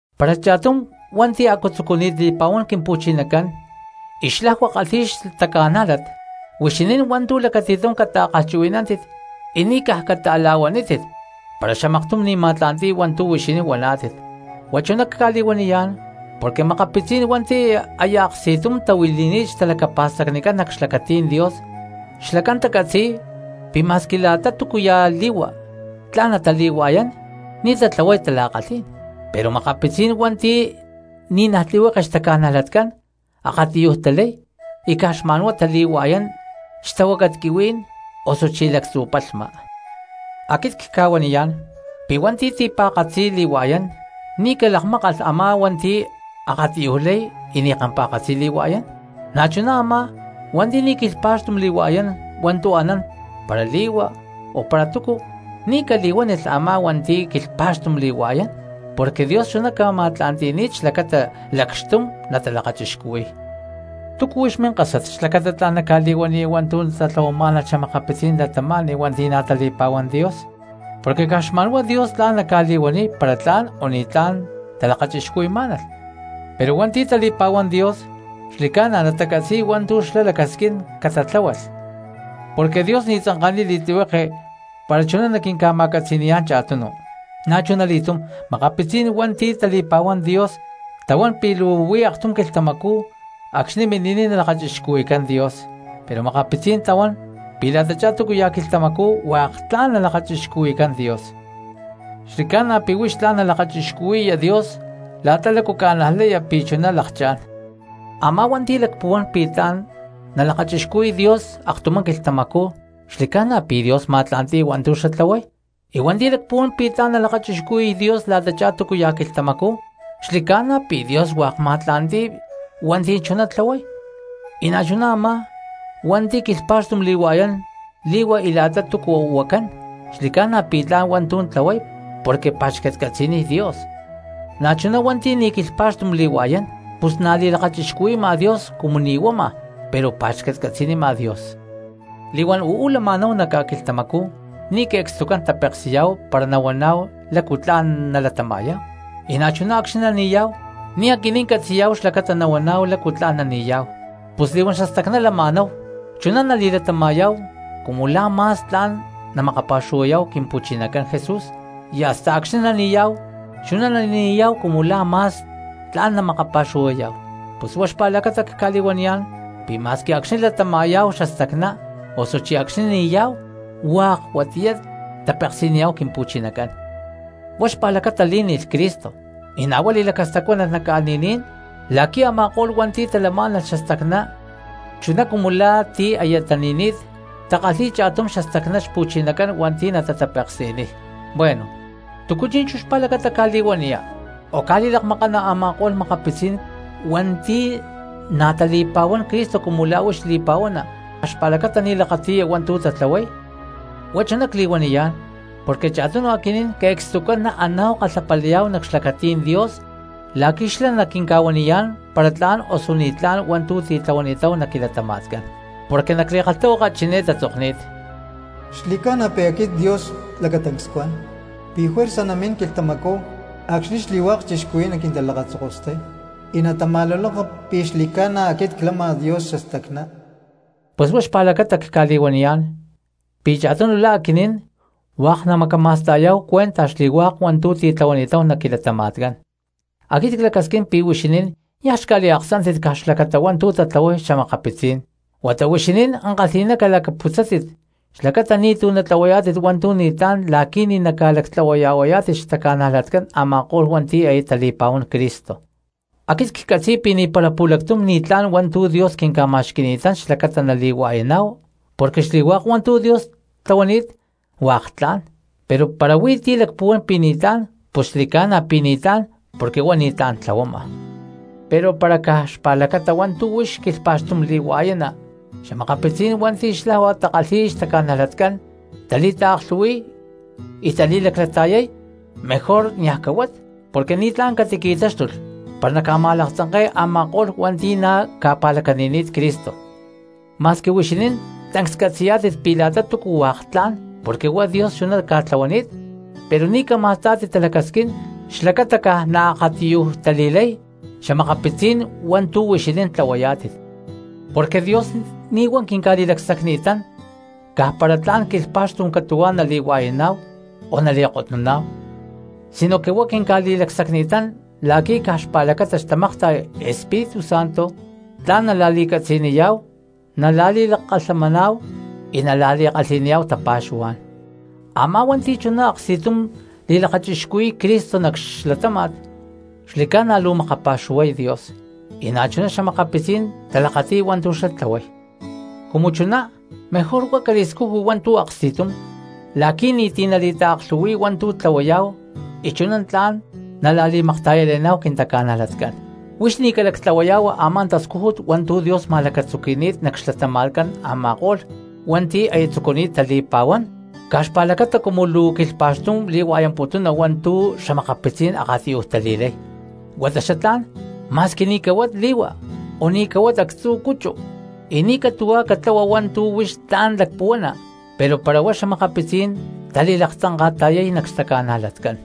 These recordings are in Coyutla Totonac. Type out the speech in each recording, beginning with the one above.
Para cha̠tum cristiano hua̠nti̠ a̠cu tzucuni̠t li̠pa̠huán Quimpu̠chinacán y xlajua kalhi̠y xtaca̠nájlat, huixinín hua̠ntu̠ lacati̠tum cata̠kalhchuhui̠nántit y ni̠ caj cata̠la̠huanítit para xamaktum ni̠ ma̠tla̠nti̠y hua̠ntu̠ huixinín huaná̠tit. Huá chuná cca̠li̠huaniyá̠n porque makapitzí̠n hua̠nti̠ aya aksti̠tum tahuili̠ni̠t xtalacapa̠stacnicán nac xlacatí̠n Dios, xlacán tacatzi̠y pi̠ ma̠squi la̠ta túcu ya̠ li̠hua tla̠n natali̠hua̠yán ni̠ tatlahuay tala̠kalhí̠n; pero makapitzí̠n hua̠nti̠ ni̠naj tlihueke xtaca̠najlatcán akatiyuj talay y caj xma̠nhuá tali̠hua̠yán xtahuácat quihuí̠n osuchí lactzu̠ palhma. Aquit cca̠huaniyá̠n pi̠ hua̠nti̠ ti̠pa̠katzi li̠hua̠yán ni̠ calakmákalh a̠má hua̠nti̠ akatiyuj lay y ni̠ kampa̠katzi li̠hua̠yán; na̠chuná chú a̠má hua̠nti̠ ni̠ quilhpa̠xtum li̠hua̠yán hua̠ntu̠ anán para li̠hua o para túcu, ni̠ cali̠huánilh a̠má hua̠nti̠ quilhpa̠xtum li̠hua̠yán, porque Dios chuná ca̠ma̠tla̠nti̠ni̠t xlacata lacxtum natalakachixcuhui̠y. ¿Túcu huix minkásat xlacata tla̠n naca̠li̠huaniya hua̠ntu̠ tatlahuamá̠nalh xa̠makapitzí̠n cristianos hua̠nti̠ na̠ tali̠pa̠huán Dios? Porque caj xma̠nhuá Dios tla̠n naca̠li̠huaniy para tla̠n o ni̠tlá̠n talakachixcuhui̠má̠nalh. Pero hua̠nti̠ tali̠pa̠huán Dios xli̠ca̠na natacatzi̠y hua̠ntu̠ xlá lacasquín catatláhualh porque Dios ni̠ tzanka̠niy li̠tlihueke para chuná naquinca̠ma̠catzi̠ni̠yá̠n cha̠tunu. Na̠chunali̠túm, makapitzí̠n hua̠nti̠ tali̠pa̠huán Dios tahuán pi̠ luu huí aktum quilhtamacú acxni̠ mini̠niy nalakachixcuhui̠cán Dios. Pero makapitzí̠n tahuán pi̠ la̠tachá túcu ya̠ quilhtamacú hua̠k tla̠n lakachixcuhui̠cán Dios. Xli̠ca̠na pi̠ huix tla̠n nalakachixcuhui̠ya Dios la̠ta lácu ca̠najlaya pi̠ chuná lakchá̠n. Amá cristiano hua̠nti̠ lacpuhuán pi̠ tla̠n nalakachixcuhui̠y Dios aktumá quilhtamacú xli̠ca̠na pi̠ Dios ma̠tla̠nti̠y hua̠ntu̠ xlá tlahuay, y hua̠nti̠ lacpuhuán pi̠ tla̠n nalakachixcuhui̠y Dios la̠tachá túcu ya̠ quilhtamacú xli̠ca̠na pi̠ Dios hua̠k ma̠tla̠nti̠y hua̠nti̠ chuná tlahuay. Y na̠chuná a̠má hua̠nti̠ quilhpa̠xtum li̠hua̠yán li̠hua y la̠ta túcu huacán xli̠ca̠na pi̠ tla̠n hua̠ntu̠ tlahuay porque pa̠xcatcatzi̠niy Dios; pero na̠chuná hua̠nti̠ ni̠ quilhpa̠xtum li̠hua̠yán, pus na̠ li̠lakachixcuhui̠ma Dios cumu ni̠ huama, pero pa̠xcatcatzi̠nima Dios. Li̠huán uú lama̠náhu nac ca̠quilhtamacú ni̠ que̠cstucán tapeksi̠yá̠hu para nahuaná̠hu lácu tla̠n nalatama̠yá̠hu, y na̠chuná acxni̠ nani̠yá̠hu ni̠ aquinín catzi̠yá̠hu xlacata nahuaná̠hu lácu tla̠n nani̠yá̠hu. Pus li̠huán xastacná latama̠yá̠hu chuná nali̠latama̠yá̠hu cumu la̠ ma̠s tla̠n namakapa̠xuhuayá̠hu Quimpu̠chinacán Jesús, y hasta acxni̠ nani̠yá̠hu chuná nani̠yá̠hu cumu la̠ ma̠s tla̠n namakapa̠xuhuayá̠hu. Pus huá xpa̠lacata cca̠li̠huaniyá̠n pi̠ ma̠squi acxni̠ latama̠yá̠hu xastacná osuchí acxni̠ ni̠yá̠hu hua̠k huatiyá tapeksi̠niyá̠hu Quimpu̠chinacán. Huá xpa̠lacata lí̠ni̠lh Cristo y na̠ huá li̠lacastacuánalh nac ca̠li̠ní̠n la̠qui̠ a̠ma̠ko̠lh hua̠nti̠ talamá̠nalh xastacná chuná cumu la̠ ti̠ aya tani̠ni̠t natakalhi̠y cha̠tum xastacná Xpu̠chinacán hua̠nti̠ natatapeksi̠niy. Bueno, ¿túcu chi̠nchú xpa̠lacata ca̠li̠huaniya, o ca̠li̠lakmakana a̠ma̠ko̠lh makapitzí̠n cristianos hua̠nti̠ na̠ tali̠pa̠huán Cristo cumu la̠ huix li̠pa̠huana caj xpa̠lacata ni̠ lakati̠ya hua̠ntu̠ tatlahuay? Huá chuná cli̠huaniyá̠n porque cha̠tunu aquinín que̠cstucán naaná̠hu kalhapalayá̠hu nac xlacatí̠n Dios la̠qui̠ xlá naquinca̠huaniyá̠n para tla̠n osu ni̠tlá̠n hua̠ntu̠ tlahuani̠táhu nac quilatama̠tcán. Porque nac li̠kalhtahuaka chiné tatzokni̠t: Xli̠ca̠na pi̠ aquit Dios lacatancs cuan pi̠ juerza namín quilhtamacú acxni̠ xli̠hua̠k cristianos naquintalakatatzokostay, y natama̠luloka pi̠ xli̠ca̠na aquit clama Dios xastacná. Pus huá xpa̠lacata cca̠li̠huaniyá̠n pi̠ cha̠tunu la̠ aquinín hua̠k namacama̠sta̠yá̠hu cuenta xli̠hua̠k hua̠ntu̠ titlahuani̠táhu nac quilatama̠tcán. Aquit clacasquín pi̠ huixinín niaj xca̠liaksántit caj xpa̠lacata hua̠ntu̠ tatlahuay xa̠makapitzí̠n quinta̠cristianoscán, huata huixinín ankalhi̠ná calacputzátit xlacata ni̠tu̠ natlahuayá̠tit hua̠ntu̠ ni̠tlá̠n la̠qui̠ ni̠ naca̠lactlahuaya̠huayá̠tit xtaca̠nalacán a̠ma̠ko̠lh hua̠nti̠ aya tali̠pa̠huán Cristo. Aquit ccatzi̠y pi̠ ni̠para pu̠lactum ni̠tlá̠n hua̠ntu̠ Dios quinca̠ma̠xqui̠ni̠tán xlacata nali̠hua̠yaná̠hu porque xli̠hua̠k hua̠ntu̠ Dios tlahuani̠t hua̠k tla̠n, pero para huí ti̠ lacpuhuán pi̠ ni̠tlá̠n pus xli̠ca̠na pi̠ ni̠tlá̠n porque huá ni̠tlá̠n tlahuama. Pero para caj xpa̠lacata hua̠ntu̠ huix quilhpa̠xtum li̠hua̠yana xa̠makapitzí̠n hua̠nti̠ xlajua takalhi̠y xtaca̠najlatcán tali̠taaklhu̠hui̠y y tali̠laclata̠yay, mejor niaj cahuat porque ni̠tlá̠n catiqui̠táxtulh para naca̠ma̠laktzanke̠ya a̠ma̠ko̠lh cristianos hua̠nti̠ na̠ ca̠pa̠lacani̠ni̠t Cristo. Ma̠squi huixinín tancs catzi̠yá̠tit pi̠ la̠ta túcu hua̠k tla̠n porque huá Dios chuná ca̠tlahuani̠t, pero ni̠ cama̠stá̠tit talacasquín xlacata caj naakatiyuj tali̠lay xa̠makapitzí̠n cristianos hua̠ntu̠ huixinín tlahuayá̠tit. Porque Dios ni̠ huá quinca̠li̠lacsacni̠tán caj para tla̠n quilhpa̠xtum catu̠huá nali̠hua̠yaná̠hu o nali̠kotnuná̠hu, sinoque huá quinca̠li̠lacsacni̠tán la̠qui̠ caj xpa̠lacata xtamakta̠y Espíritu Santo tla̠n nala̠li̠catzi̠niyá̠hu, nala̠li̠lakalhamaná̠hu y nala̠li̠kalhi̠niyá̠hu tapa̠xuhuá̠n. Amá cristiano hua̠nti̠ chuná aksti̠tum li̠lakachixcuhui̠y Cristo nac xlatáma̠t xli̠ca̠na luu makapa̠xuhuay Dios y na̠chuná cristianos talakati̠y hua̠ntu̠ xlá tlahuay. Cumu chuná mejor huá cali̠scujui hua̠ntu̠ aksti̠tum la̠qui̠ ni̠ti̠ nali̠taaklhu̠hui̠y hua̠ntu̠ tlahuayá̠hu y chuná tla̠n nala̠li̠makta̠yale̠ná̠hu quintaca̠najlatcán. Huix ni̠ calactlahuaya̠hua a̠má tascújut hua̠ntu̠ Dios ma̠lacatzuqui̠ni̠t nac xlatama̠tcán a̠ma̠ko̠lh cristianos hua̠nti̠ aya tatzucuni̠t tali̠pa̠huán caj xpa̠lacata cumu luu quilhpa̠xtum li̠hua̠yamputuna hua̠ntu̠ xa̠makapitzí̠n akatiyuj tali̠lay. Huata xatlá̠n ma̠squi ni̠ cahuat li̠hua o ni̠ cahuat actzu̠ cuchu y ni̠ catu̠hua catlahua hua̠ntu̠ huix tla̠n lacpuhuana, pero para huá xa̠makapitzí̠n tali̠laktzanka̠ta̠yay nac xtaca̠najlatcán.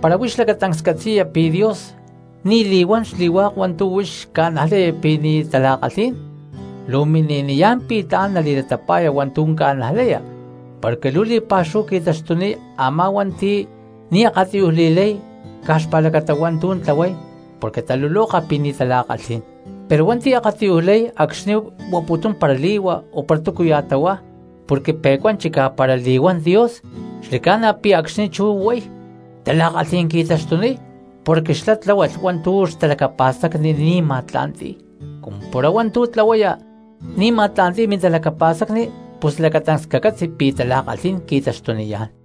Para huix lacatancs catzi̠ya pi̠ Dios ni̠ li̠huán xli̠hua̠k hua̠ntu̠ huix ca̠najlaya pi̠ ni̠ tala̠kalhí̠n, luu mini̠niyá̠n pi̠ tla̠n nali̠latapa̠ya hua̠ntu̠ ca̠najlaya porque luu li̠pa̠xúhu qui̠taxtuniy a̠má cristianos hua̠nti̠ ni̠ akatiyuj li̠lay caj xpa̠lacata hua̠ntu̠ tlahuay porque taluloka pi̠ ni̠ tala̠kalhí̠n. Pero a̠má cristiano hua̠nti̠ akatiyuj lay acxni̠ huaputún para li̠hua o para túcuya̠ tahuá porque pe̠cuán chicá para li̠huán Dios, xli̠ca̠na pi̠ acxni̠ chú huay tala̠kalhí̠n qui̠taxtuniy porque xlá tláhualh hua̠ntu̠ xtalacapa̠stacni ni̠ ma̠tla̠nti̠y, cumu para hua̠ntu̠ tlahuaya ni̠ ma̠tla̠nti̠y mintalacapa̠stacni pus lacatancs cacatzi pi̠ tala̠kalhí̠n qui̠taxtuniyá̠n.